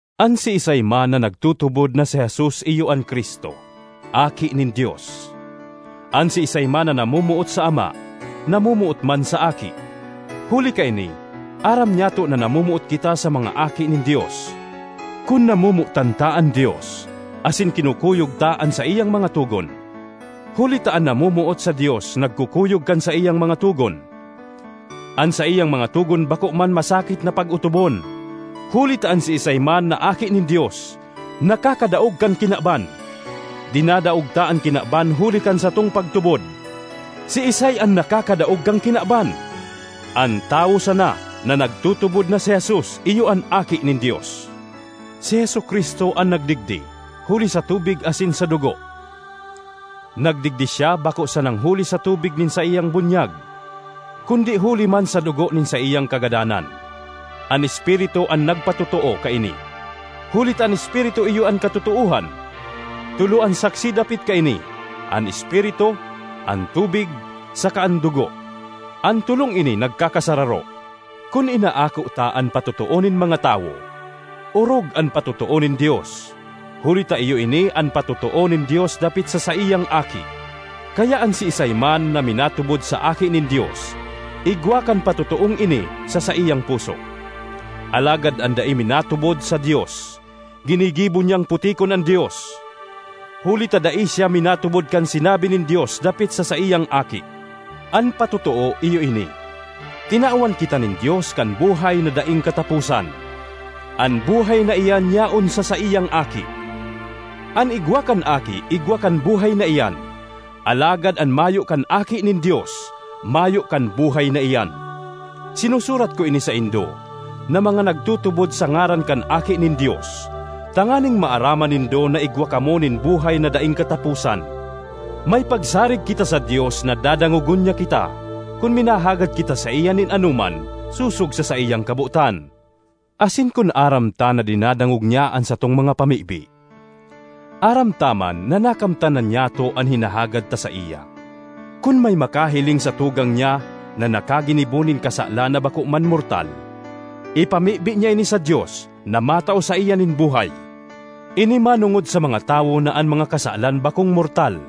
An siisay man na nagtutubod na si Jesus iyo an Cristo, aki nin Dios; an siisay man na namomoot sa ama, namomoot man sa aki. Huli kaini aram nyato na namomoot kita sa mga aki nin Dios, kun namomotan ta an Dios asin kinukuyog ta an saiyang mga togon. Huli ta an namomoot sa Dios nagkukuyog kan saiyang mga togon. An saiyang mga togon bako man masakit na pag-otobon, huli ta an siisay man na aki nin Dios nakakadaog kan kinaban. Dinadaog ta an kinaban huli kan satong pagtubod. Siisay an nakakadaog kan kinaban? An tawo sana na nagtutubod na si Jesus iyo an Aki nin Dios. Si Jesu-Cristo an nagdigdi huli sa tubig asin sa dugo; nagdigdi siya bako sanang huli sa tubig nin saiyang bunyag, kundi huli man sa dugo nin saiyang kagadanan. An Espiritu an nagpatotoo kaini, huli ta an Espiritu iyo an katotoohan. Tolo an saksi dapit kaini: an Espiritu, an tubig saka an dugo; an tolong ini nagkakasararo. Kun inaako ta an patotoo nin mga tawo, orog an patotoo nin Dios; huli ta iyo ini an patotoo nin Dios dapit sa saiyang Aki. Kaya an siisay man na minatubod sa Aki nin Dios igwa kan patotoong ini sa saiyang puso; alagad an dai minatubod sa Dios, ginigibo niyang putikon an Dios, huli ta dai siya minatubod kan sinabi nin Dios dapit sa saiyang Aki. An patotoo iyo ini: tinawan kita nin Dios kan buhay na daing kataposan; an buhay na iyan yaon sa saiyang Aki. An igwa kan Aki igwa kan buhay na iyan; alagad an mayo kan Aki nin Dios mayo kan buhay na iyan. Sinusurat ko ini saindo na mga nagtutubod sa ngaran kan Aki nin Dios, tanganing maaraman nindo na igwa kamo nin buhay na daing kataposan. May pagsarig kita sa Dios na dadangogon niya kita kun minahagad kita saiya nin anoman sosog sa saiyang kabotan. Asin kun aram ta na dinadangog niya an satong mga pamibi, aram ta man na nakamtan na nyato an hinahagad ta saiya. Kun may makahiling sa tugang niya na nakaginibo nin kasalan na bako man mortal, ipamibi niya ini sa Dios na matao saiya nin buhay. Ini manongod sa mga tawo na an mga kasalan bakong mortal.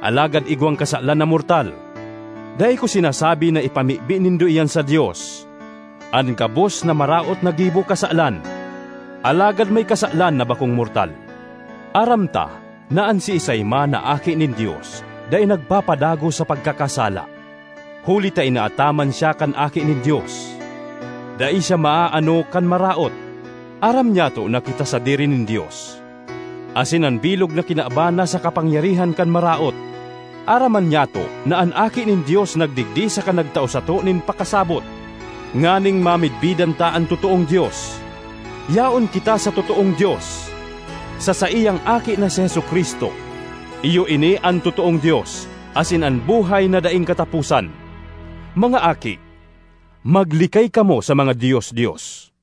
Alagad igwang kasalan na mortal. Dai ko sinasabi na ipamibi nindo iyan sa Dios. An gabos na maraot na gibo kasalan, alagad may kasalan na bakong mortal. Aram ta na an siisay man na aki nin Dios dai nagpapadagos sa pagkakasala, huli ta inaataman siya kan Aki nin Dios; dai siya maaano kan Maraot. Aram nyato na kita sadiri nin Dios, asin an bilog na kinaban nasa kapangyarihan kan Maraot. Aram man nyato na an Aki nin Dios nagdigdi saka nagtao sato nin pakasabot, nganing mamidbidan ta an totoong Dios. Yaon kita sa totoong Dios, sa saiyang Aki na si Jesu-Cristo. Iyo ini an totoong Dios, asin an buhay na daing kataposan. Mga aki, maglikay kamo sa mga dios-dios.